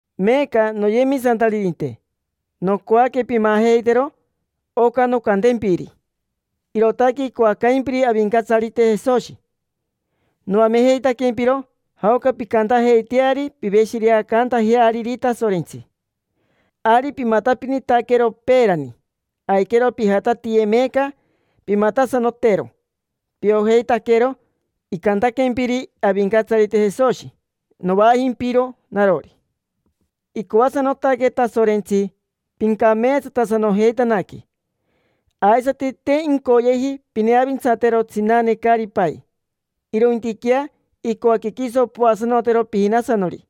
Meeca, noyemisantaririnte, nocoaque pimajeitero oca noncantempiri: irootaque icoacaimpiri Avincatsarite Jesoshi. Noamejeitaquempiro jaoca pincantajeiteari piveshireacantajeariri Tasorentsi. Ari pimatapinitaquero peerani: aiquero pijatatiye meeca, pimatasanotero. Piojeitaquero icantaquempiri Avincatsarite Jesoshi, novaajimpiro narori. Icoasanotaque Tasorentsi pincameetsatasanojeitanaque. Aisati te incoyeji pineavintsatero tsinane caari pai, irointiquea icoaque quiso poasanotero pijinasanori.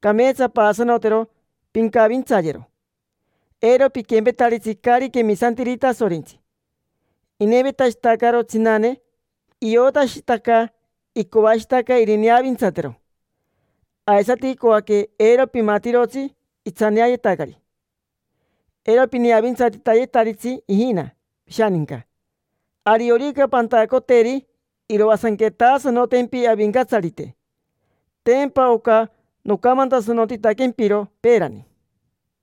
Cameetsa paasanotero, pincavintsayero. Eiro piquempetaritsi caari quemisantiri Tasorentsi: inevetashitacaro tsinane, iotashitaca icoashitaca irineavintsatero. Aisati icoaque eiro pimatirotsi itsaneayetacari. Eiro pineavintsatitayetiritsi ijina pishaninca. Ariorica pantacoteri, iroasanquetasanotempi Avincatsarite. Tempa oca nocamantasanotitaquempiro peerani.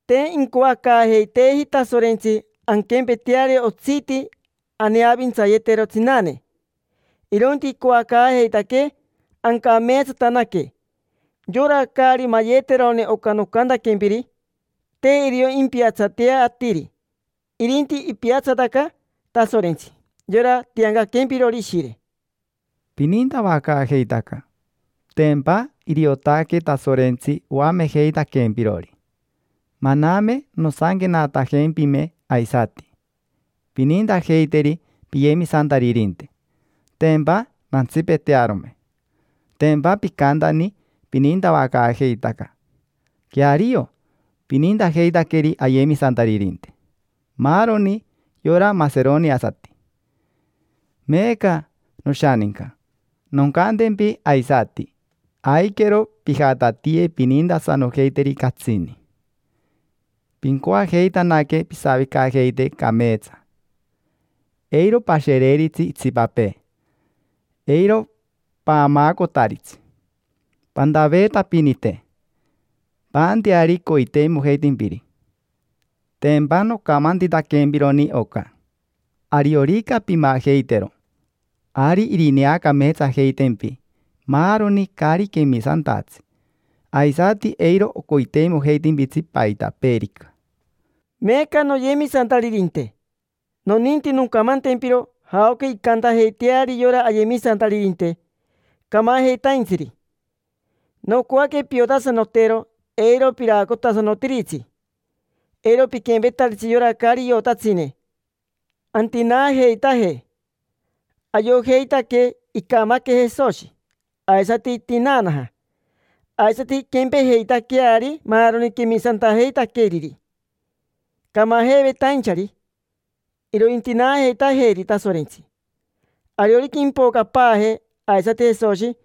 Te incoacaajeiteeji Tasorentsi anquempeteari otsiti aneavintsayetero tsinane, irointi icoacaajeitaquee ancameetsatanaque. Yora caari mayeterone oca nocantaquempiri, te irio impiatsatea atiri, irinti ipiatsataca Tasorentsi: yora tiancaquempirori Ishire. Pinintavacaajeitaca: tempa iriotaque Tasorentsi oamejeitaquempirori. Maname nosanquenatajempime aisati: “Pinintajeiteri piyemisantaririnte”, tempa nantsipetearome. Tempa picantani pinintavacaajeitaca. Queario, pinintajeitaqueri ayemisantaririnte: maaroni yora maseroniasati. Meeca, noshaninca, noncantempi aisati, aiquero pijatatiye pinintasanojeiteri catsini. Pincoajeitanaque pisavicajeite cameetsa. Eiro pashereiritsi itsipapee. Eiro paamaacotaritsi. Pantaveetapinite, paanteari coiteimojeitimpiri. Tempa nocamantitaquempironi oca. Ariorica pimajeitero, ari irineacameetsajeitempi maaroni caari quemisantatsi, aisati eiro ocoiteimojeitimpitsi paitapeerica. Meeca, noyemisantaririnte, noninti noncamantempiro jaoca incantajeiteari yora ayemisantaririnte, camajeitaintsiri. Nocoaque piotasanotero. Eiro piraacotasanotiritsi, eiro piquempetaritsi yora caari iotatsine antinaajeitaje. Ayojeitaque icamaque Jesoshi, aisati itinaanaja. Aisati inquempejeitaqueari maaroni quemisantajeitaqueriri, camajeivetainchari: irointinaajeitajeri Tasorentsi. Ariorica impocapaaje aisati Jesoshi,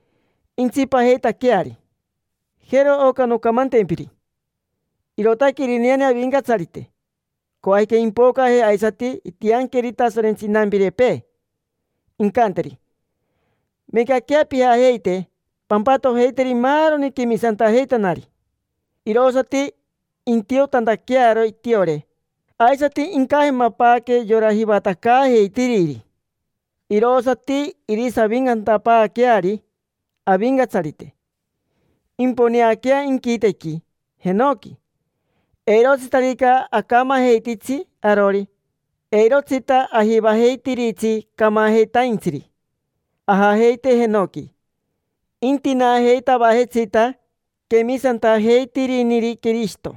intsipajeitaqueari. Jero oca noncamantempiri, irootaque irineane Avincatsarite. Coajica impocaje, aisati intianqueri Tasorentsi inampirepee, incanteri: “Meecaquea pijajeite pampatojeiteri maaroni quemisantajeitanari”. Irosati intiotantaquearo itiore, aisati incajemapaaque yora jivatacaajeitiriri. Irosati irisaviincantapaaqueari Avincatsarite, imponeaquea inquitequi jenoqui. Eirotsitarica acamajeititsi arori, eirotsita ajivajeitiritsi camajeitaintsiri ajajeite jenoqui. Intinaajeitavajetsita quemisantajeitiriniri Quirishito.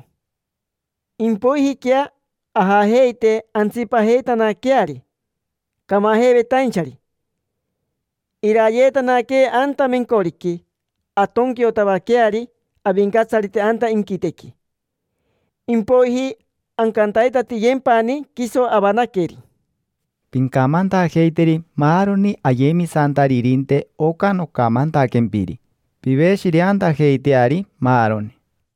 Impoijiquea ajajeite, antsipajeitanaqueari camajeivetainchari. Iraayeetanaquee anta mencoriqui, antonquiotavaqueari Avincatsarite anta inquitequi. Impoiji ancantaitatiyempani quiso avanaqueri. Pincamantajeiteri maaroni ayemisantaririnte oca nocamantaquempiri, piveshireantajeiteari, maaroni.